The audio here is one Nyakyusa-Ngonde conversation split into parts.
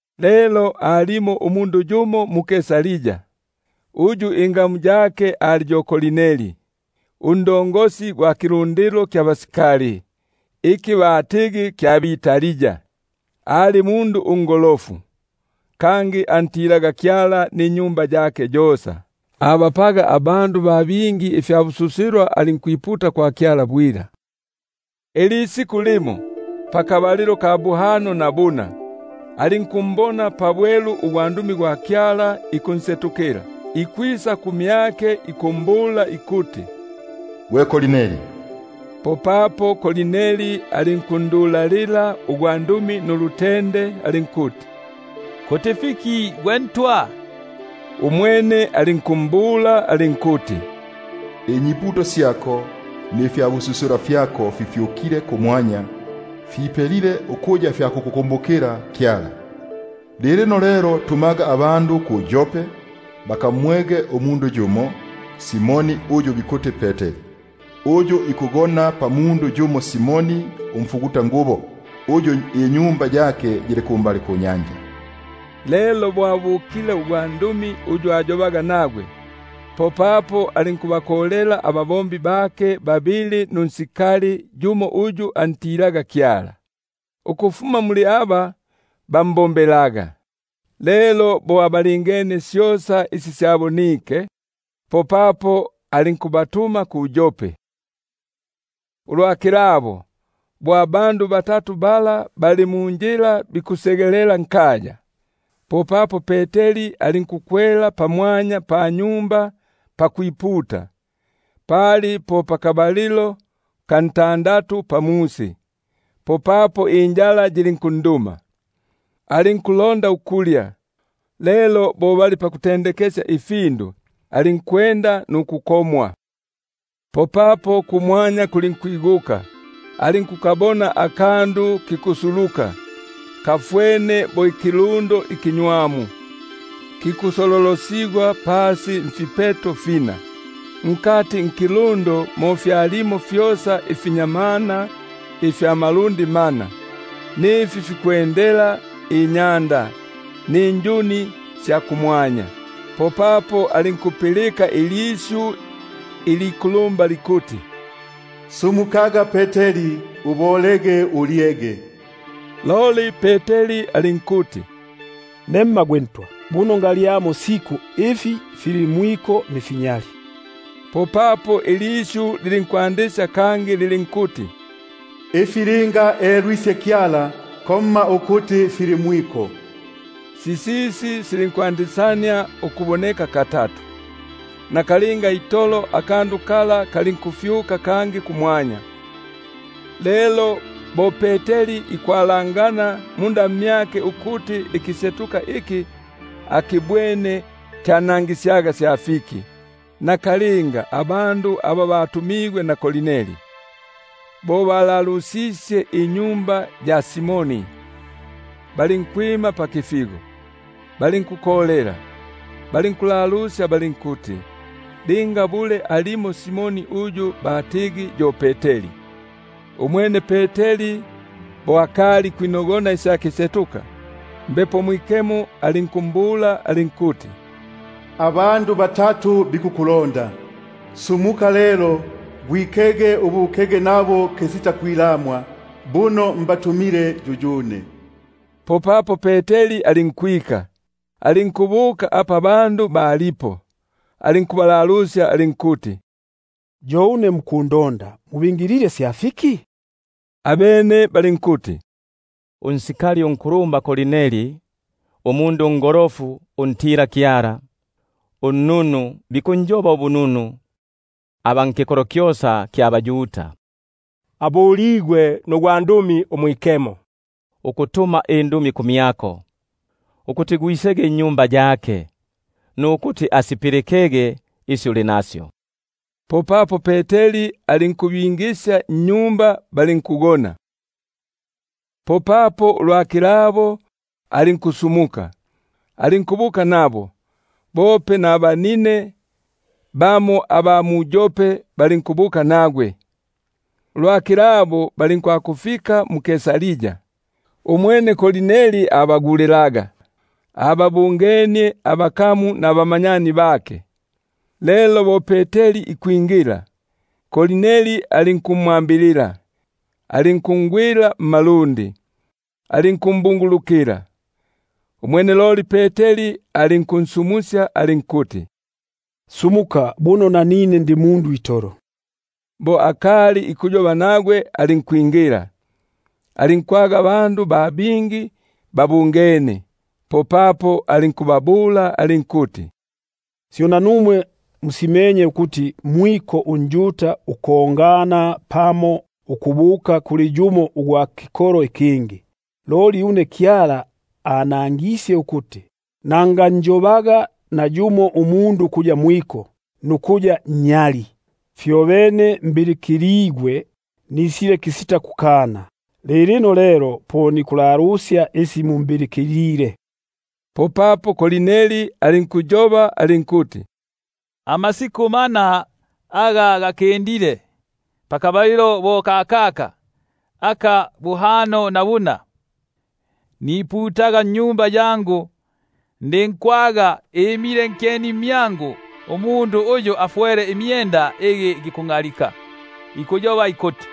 Lelo alimo umundu yumo mu-Kaisaria, uyu ingamu yake ali yo Korneli, sarjenti gwa kilundilo kya basikali iki batigi kya bʼItali; ali mundu ungolofu, kangi antilaga Kyala ninyumba yake yosa, abapaga abandu ba bingi ifyabususilwa, alinkwiputa kwa Kyala bwila. Ilisiku limo pakabalilo ka buhano na buna, alinkumbona pabwelu ugwandumi gwa Kyala ikunsetukila, ikwisa kumyake ikumbula ikuti: Gwe Korneli! Popapo alinkundulalila nulutende alinkuti: Kuti fiki gwe Ntwa? Umwene alinkumbula alinkuti: Inyiputo syako nifyabususilwa fyako Afyukile kumwanya, Apelile ukuya fya kukukumbukilamo Kyala. Lilino lelo tumaga abandu mu-Yope, bakamwege umundu yumo, Simoni uyu bikuti yo Peteri, uyu ikugona pamundu yumo Simoni umfugu- tangubo, uyu inyumba yake yili pambali panyanja. Lelo bo abukile ugwandumi uyu ayobaga nagwe, popapo alinkubakolela ababombi bake babili nunsikali yumo uyu antilaga Kyala, ukufuma muli aba bambombelaga; lelo bo abalingenie syosa isi syabonike, popapo alinkubatuma mu-Yope. Ulwa kilabo, bo abandu bala bali munjila bikusegelela nkaya, popapo Peteri alinkukwela pamwanya panyumba pakwiputa, paliti pali po pakabalilo ka ntandatu. Popapo injala yilinkunduma, alinkulonda ukulya; lelo bo bali paku- ntendekekesya ifindu, alinkwenda nukukomwa. Popapo kumwanya kulinkwiguka, alinkukabona akandu kikusuluka, kafwene bo ikilundo Unnywamu kikusololosigwa pasi mfipeto fina; mo fyalimo fyosa ifinyamana ifya malundi mana, nifi fikwendela inyanda, ninjuni sya kumwanya. Popapo alinkwaga ilisyu Ukumbula likuti: Sumukaga Peteri, ubolege ulyege. Loli Peteri alinkuti: Nemma gwe Ntwa, buno ngalyamo siku ifi fili mwiko nifinyali. Popapo nisyu lilinkwandisya lilinkuti: Ifi linga elwisye Kyala, komma ukuti fili mwiko. Sisisi silinkwandisania ukuboneka katatu, nakalinga itolo akandu kala kalinkufyuka kangi kumwanya. Lelo bo Peteri ikwalangana munda mmyake ukuti ikisetuka iki akibwene kyanangisyaga sya fiki, nakalinga abandu aba batumigwe na Korneli, bo balalusisye inyumba ya Simoni, balinkwima pakifigo, balinkukolela, balinkulalusya linga alimo Simoni uyu batigi yo Peteri. Umwene Peteri bo akali ikwinogona isya kisetuka, Mbepo Mwikemo alinkumbula alinkuti: Abandu batatu bikukulonda. Sumukaga lelo, gwikege ubukege nabo kisitakwilamwa, buno mbatumile yuyune. Popapo Peteri alinkwika, alinkubuka apa abandu balipo, alinkubabula alinkuti: Yo une ne mukundonda; mubingilile sya fiki? Abene balinkuti: Sarjenti Korneli, umundu ungolofu untila-Kyala, uyu bikunjoba ubununu aba nkikolo kyosa kya baYuda, abuligwe nugwandumi umwikemo ukutuma indumi kumyako, ukuti gwisege nnyumba yake, nukuti asipilikege isi uli nasyo. Popapo alinkubingisya nnyumba, balinkugona. Popapo ulwa kilabo alinkusumuka, alinkubuka nabo, bope nabanine bamo aba mu-Yope balinkubuka nagwe. Ulwa kilabo, balinkufika mu-Kaisaria. Umwene Korneli abaguli- laga, ababungenie abakamu nabamanyani bake. Lelo bo Peteri ikwingila, Korneli alinkumwambilila, alinkungwila mmalundi, alinkumbungulukila. Umwene loli Peteri alinkunsumusya alinkuti: Sumuka buno nanine ndi mundu itolo. Bo akali ikuyoba nagwe alinkwingila, alinkwaga abandu ba bingi babungene. Popapo alinkubabula alinkuti: Syo nanumwe musimenye ukuti mwiko unjuda ukongana pamo ukubuka kuli yumo ugwa kikolo ikingi; loli une Kyala anangisye ukuti nanganjobaga nayumo umundu ukuya mwiko, nukuya nnyali. Fyobene bo mbilikiligwe, nisile kisita kukana. Lilino lelo po nikulalusya isi mumbilikilile. Popapo Korneli alinkuyoba alinkuti: Amasiku mana aga gakindile, pakabalilo bo kakaka aka buhano na buna, niputaga nnyumba yangu; ndinkwaga imile nkyeni mmyangu umundu uyu afwele imye- nda igi gikungʼalika, ikuyoba ikuti: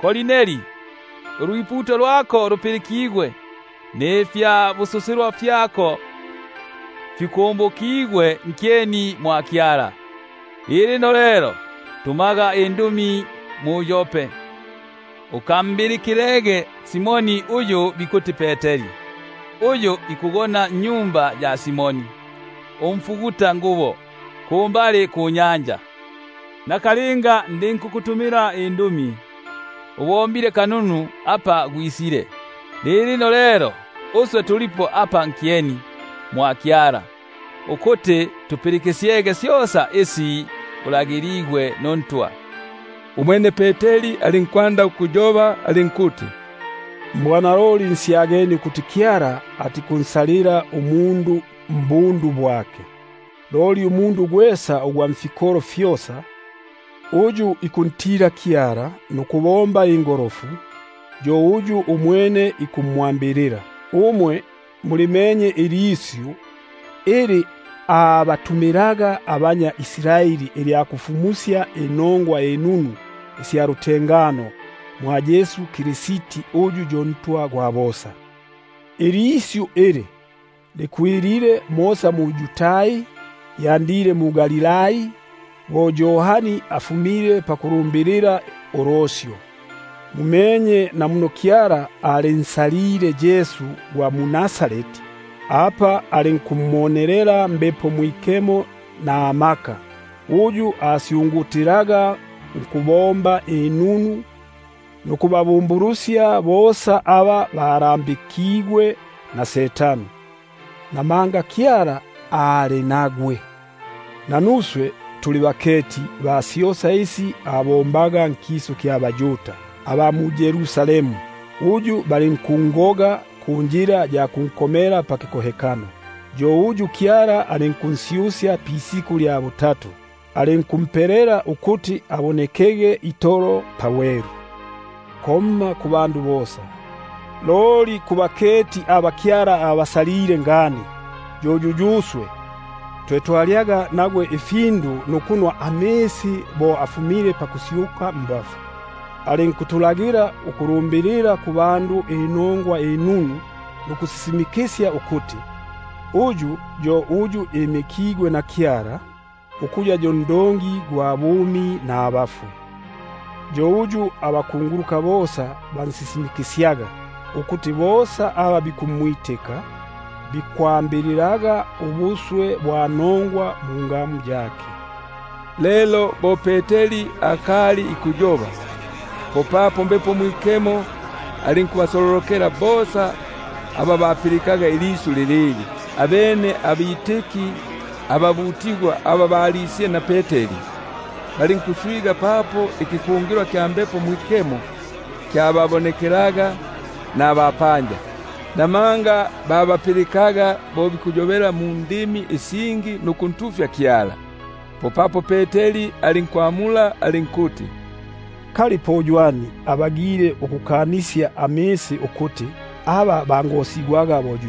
Korneli, ulwiputo lwako lupilikigwe, nifyabususilwa fyako fikumbukigwe nkyeni mwa Kyala. Lilino lelo tumaga indumi mu-Yope, umbilikilege Simoni uyu bikuti yo Peteri, uyu ikugona nnyumba ya Simoni umfugutangubo, pambali panyanja. Nakalinga lelo ndinkukutumila indumi, ubombile kanunu apa gwisile. Lilino lelo uswe twesa tulipo apa nkyeni mwa Kyala, ukuti tupilikisyege syosa isi ulagiligwe nuNtwa. Umwene Peteri alinkwinula imilomo, alinkuyoba alinkuti: Mbwanaloli ngusyagania ukuti Kyala atikunsalila umundu mbundu bwake; loli nifikolo fyosa, uyu ikuntila nukubomba ingolofu, yo uyu umwene ikumwambilila. Umwe mulimenye ilisyu ili anatumilaga abanyʼIsraeli ilya kufumusya inongwa inunu isya lutengano mwa Yesu Kristi. (Umwene yo yuNtwa gwa bosa.) Ilisyu ili likwilile mosa mu-Yudai, lyalyandile mu-Galilai, bo Yohani afumile pakulufumusya ulosyo, na muno Kyala ampakaga Yesu ugwa mu-Nazareti Mbepo Mwikemo namaka, uyu asyungutilaga nkubomba inunu, nukubabumbulusya bosa aba abalambike umohesi; namanga Kyala ali nagwe. Nanuswe tuli baketi ba syosa isi abombaga nkisu kya baYuda, na mu-Yerusalemu; uyu balinkungoga bo bikunkomela pakipiki. Yo uyu Kyala alinkunsyusya pisiku lya butatu, alinkumpelela ukuti abonekege itolo pabwelu, komma kubandu bosa, loli kubaketi aba Kyala abasalile ngani — yo yuyuswe, twe twalyaga nukunwa nagwe bo afumile paku- syuka mbafwe. Alinkutulagila nkufumusya kubandu nukusisimikisya ukuti, uyu yo uyu imikigwe na Kyala ukuya yo ndongi gwa bumi nabafwe. Yo uyu bosa abakunguluka bikunsisimikisya, ukuti bosa aba bikumwitika, bikwambilila ubuswe bwa nongwa mungamu yake. Lelo bo Peteri akali ikuyoba, popapo Mbepo Mwikemo alinkubasololokela bosa aba bapilikaga ilisyu lilili. Abene abitiki ababutigwako, aba balisile na Peteri, balinkuswiga papo ikikungilwa kya Mbepo Mwikemo kyababonekelaga nabapanja; namanga babapilikaga bo bikuyobela mundimi isingi nukuntu- fya Kyala. Popapo Peteri alinkwamula alinkuti: Kali ywani abagile ukukanisya amisi ukuti aba bangosigwaga, aba bope